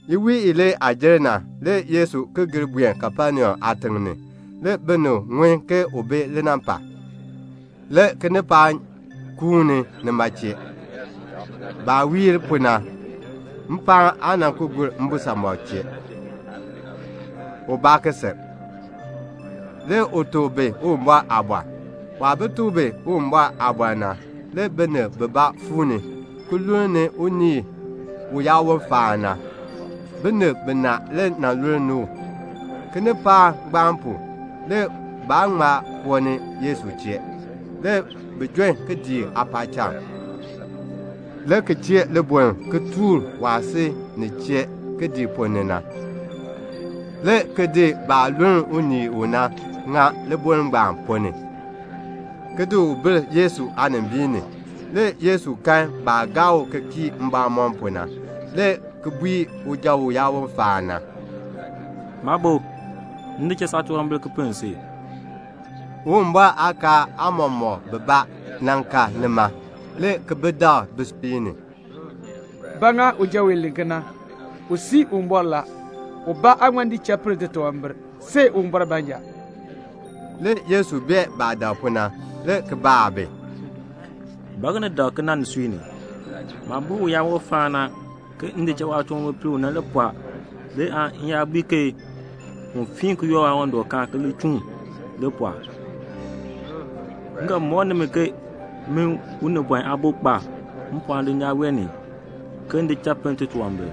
Iwiin ilee aah jer na, le Yesu ki gir buen Kapenaum aatiŋ ni. Le binib ŋun ke u bi linampal. Le kinipaak kuuni nima chee. Baah wiir pu na, mpaan aa ki gur mbisamɔb chee, ubaa ki sil. Le u tuk bi Uwumbɔr aaliin. Waah bi tuk bi Uwumbɔr aaliin na, le binib bibaa fuu ni, ki lulni unii uyaawon faan na. Binib binaa le lulni u. Kinipaak ngbaan pu, le baa ŋma koo ni Yesu chee. Le bi jon kidiik aapaacham, le ki chee liboln ki tuur waah si nin chee kidiik ponn ni na, le ki di baah luln unii u na ki ŋa liboln ngbaan ponn ni, ki di bil Yesu aanimbiin ni. Le Yesu kan baah gaa u ki kii mbamɔm pu na, le ki bui uja uyaawon faan na, "Maabo, m di cha saatunwambir ki pinn si." Le Uwumbɔr aakaal aamɔmɔkb bibaa ka nima, le ki bi dak bisui ni, "Ba ŋa uja wee len kena? U sii Uwumbɔr la. Ubaa aan ŋma di cha pinn titunwambir, see Uwumbɔr baanja." Le Yesu bee baah dak pu na, le ki baa bi, "Ba ŋa ni dak kena nisui ni? Maah bui uyaawon faan na ke m di cha waatunwambir pinn u na, nima le pɔɔ le aan m yaa bui u ke un fiin ki yoor waawandɔkaan ki li chuun, li pɔɔ ɔɔ? M ga mɔk nimi ke min, Unibɔn Aabo, kpa mpɔɔn dulnyaa wee ni ke m di cha pinn titunwambir."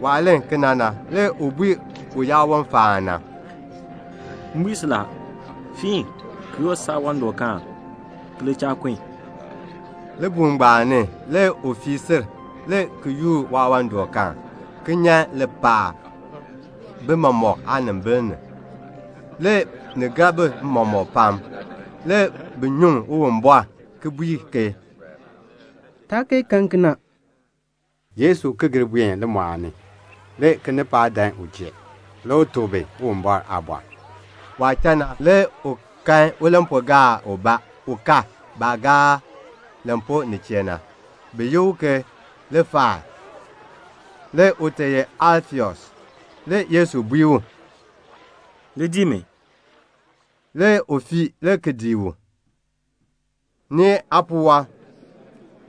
Waah len kena na, le u bui uyaawon faan na, "M bui si la, fiin, ki yoor saawandɔkaan, ki li cha kun." Libuul ngbaan ni le u fii sil, le ki yoor waawandɔkaan, ki nyan lipaal bi mɔmɔk aanimbil ni. Le ni gar bi mɔmɔk pam. Le bi nyuŋ Uwumbɔr, le ki bui ke, "Taa kee kan kena." Le Yesu ki gir buen limɔɔl ni. Le kinipaak dan u chee. Le u tuk bi Uwumbɔr aaliin. Waah cha na, le u kan ulampuugaar ubaa ka baah gaar lampuu nin chee na. Bi yi u ke Liifai, u ye Alfeus aajapɔɔn. Le Yesu bui u, "Li dii mi." Le u fii, le ki dii u. Nee aapuwɔb,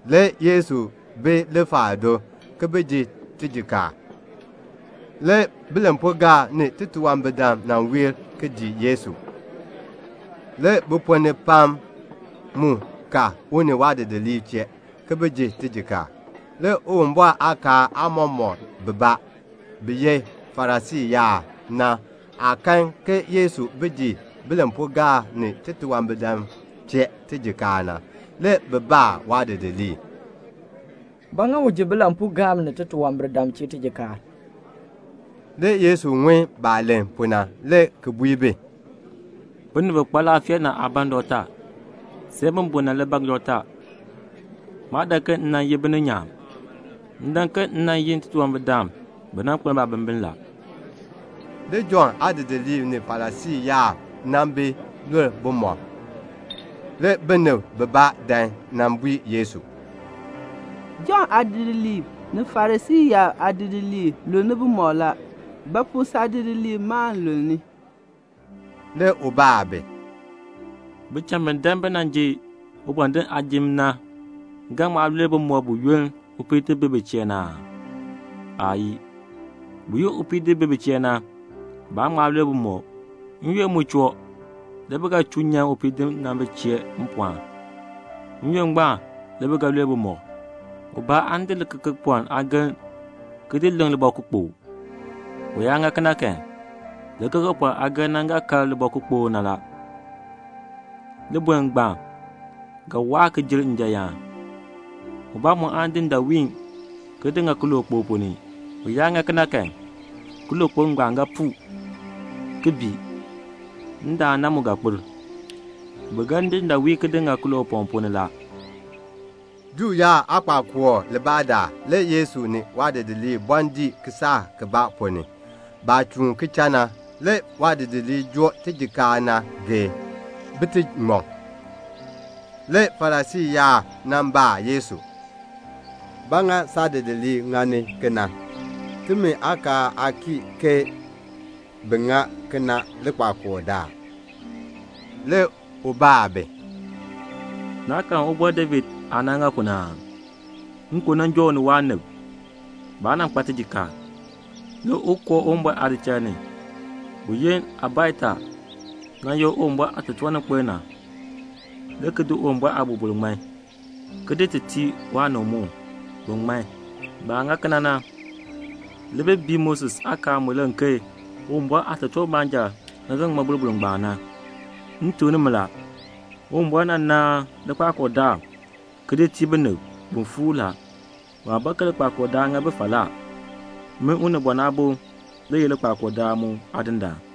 le Yesu bi Liifai do, ki bi ji tijikaar. Le bilampuugaab ni titunwambirdam nan wiir, le ki dii Yesu. Le bi ponn ni pam mu ka u ni waadidiliib chee, ki bi ji tijikaar. Le Uwumbɔr aakaal aamɔmɔkb bibaa, bi ye Farisii yaab na, baah kan ke Yesu bi ji bilampuugaab ni titunwambirdam chee tijikaar na, le bi baa waadidiliib, "Ba ŋa u ji bilampuugaab ni titunwambirdam chee tijikaar?" Le Yesu ŋun baah len pu na, le ki bui bi, "Binib bi kpa laafee na aa ban dɔkta, see bi bun na le ban dɔkta. Maa dan ke m nan yi bininyaan. M dan ke m nan yi titunwambirdam bi nan kpeln baabimbin." Le Jɔnn aadidiliib ni Farisii yaab nan bi lul bumɔb. Le binib bibaa dan nan bui Yesu, "Jɔnn aadidiliib ni Farisii yaab aadidiliib lul bumɔb la. Ba pu saadidiliib ma aa lul?" Le u baa bi, "Bicham bi dan bi nan ji ubɔndinn aajim na ga ŋma lul bumɔb buyoonn upiidinn bi bi chee na aa? Aayii. Buyoonn upiidinn bi bi chee na, baan ŋma lul bumɔb. N-yoonn mu choo, le bi ga chuu nyan upiidinn na bi chee mpɔɔn. N-yoonn ngbaan le bi ga lul bumɔb. "Ubaa aan di likekepɔln aageln, ki di leŋ libɔkukpokl. U yaa ŋa kena kan, likekepɔln aageln na ga kar libɔkukpokl na. Liboln ngbaan ga jer njan yaan. Ubaa mu aan di ndaawiin, ki di ŋa kilookpok ponn ni. U yaa ŋa kena kan, kilookpok na ga puu, ki bii. Ndaan na mu ga kpir. Bi ga di ndaawiin ki di ŋa kiloopɔŋ ni la." Juu yaab aakpakool libaa daal, le Yesu ni waadidiliib bɔɔ dii kisaak ponn ni. Baah chuun ki cha na, le waadidiliib joo tijikaar na geei, bi ti ŋmɔ. Le Farisii yaab nan baa Yesu, "Ba ŋa saadidiliib ŋani kena? Timi aakaal aa kii ke bi ŋa kena likpakool daal." Le u baa bi, "Naa karn Ubɔr David aah nan ŋa pu na aa? Nkon nan joo u ni waanib. Baa nan kpa tijikaar. Le u koo Uwumbɔr aadichal ni, buyoonn Abiatar nan ye Uwumbɔr aatotoorninkpil na, le ki di Uwumbɔr aaboroboro, ki di ŋman, ki di tii waanib mu, bin ŋman. Baah ŋa kena na, le bi bii Moses aakaal mu len ke Uwumbɔr aatotoortiib baanja le ga ŋmɔ boroboro ngbaan. "M tuk nimi la, Uwumbɔr nan naan likpakool daal ki di tii binib, bin fuur. Waa ban ke likpakool daal ŋa bi falaa. Min Unibɔn Aabo le ye likpakool daal mu Aadindaan."